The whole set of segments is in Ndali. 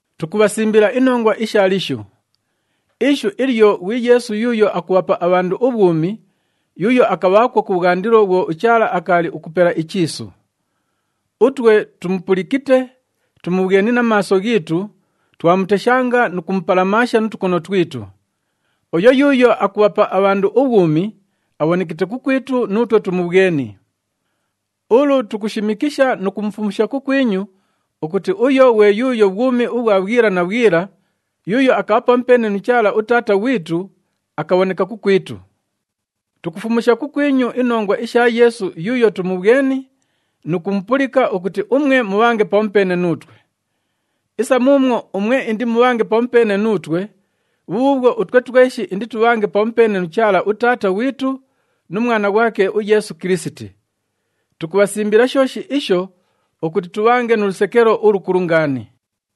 Tukubhasimbila inongwa isha Lishu. Ishu ilyo ghwi Yeesu yuuyo akubhapa abhandu ubhwumi, yuuyo akabhaakwo kubhwandilo bhwo uChaala akaali ukupela ichiisu. Utwe tumupulikite, tumubhweni na maaso ghiitu, twamuteshanga nu kumupalamaasha nu tukono twitu. Uyo yuuyo akubhapa abhandu ubhwumi, abhonekite kukwitu nuutwe tumubhweni. Ulu tukushimikisha nu kumufumusha kukwinyu ukuti uyo ghwe yuuyo bhwumi ubhwa bhwila na bhwila, yuuyo akabha pamupeene nu Chaala uTaata ghwitu, akabhoneka kukwitu. Tukufumusha kukwinyu inongwa isha Yeesu yuuyo tumubhweni nu kumupulika ukuti umwe mubhange pamupeene nuutwe. Isa muumwo umwe indimubhange pamupeene nuutwe, bhubhuubhwo utwe tweshi inditubhange pamupeene nu Chaala uTaata ghwitu nu Mwana ghwake uYeesu Kilisiti. Tukubhasimbila shooshi isho ukuti tubhange nu lusekelo ulukulu ngaani.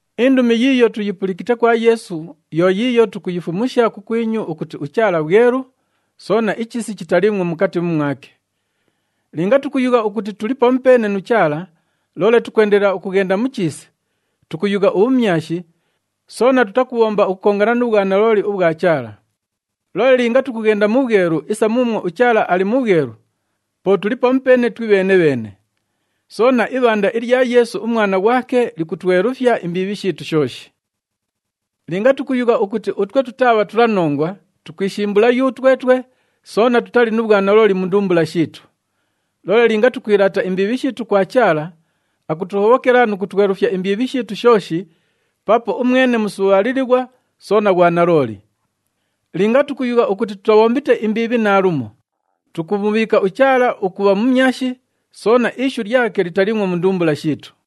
Indumi yiiyo tuyipulikite kwa Yeesu yo yiiyo tukuyifumusha kukwinyu ukuti uChaala bhwelu, soona ichiisi chitaliimwo mukati mumwake. Linga tukuyugha ukuti tuli pamupeene nu Chaala, loole tukwendelela ukughenda mu chiisi, tukuyugha ubhumyashi, soona tutakubhomba ukukongana nu bhwanalooli ubhwa Chaala. Loole linga tukughenda mu bhwelu isa muumwo uChaala ali mu bhwelu, po tuli pamupeene twibheene-bheene. Soona, ibhanda ilya Yeesu uMwana ghwake likutwelufya imbiibhi shiitu shooshi. Linga tukuyugha ukuti utwe tutaa bhatulanongwa, tukwishimbula yutwetwe, soona tutali nu bhwanalooli mu ndumbula shiitu. Loole linga tukwilaata imbiibhi shiitu kwa Chaala, akutuhobhokela nu kutwelufya imbiibhi shiitu shooshi paapo umwene musubhaalilighwa soona ghwanalooli. Linga tukuyugha ukuti tutabhombite imbiibhi naalumo, tukumubhiika uChaala ukubha mumyashi, soona ishu lyake litaliimwo mu ndumbula shiitu.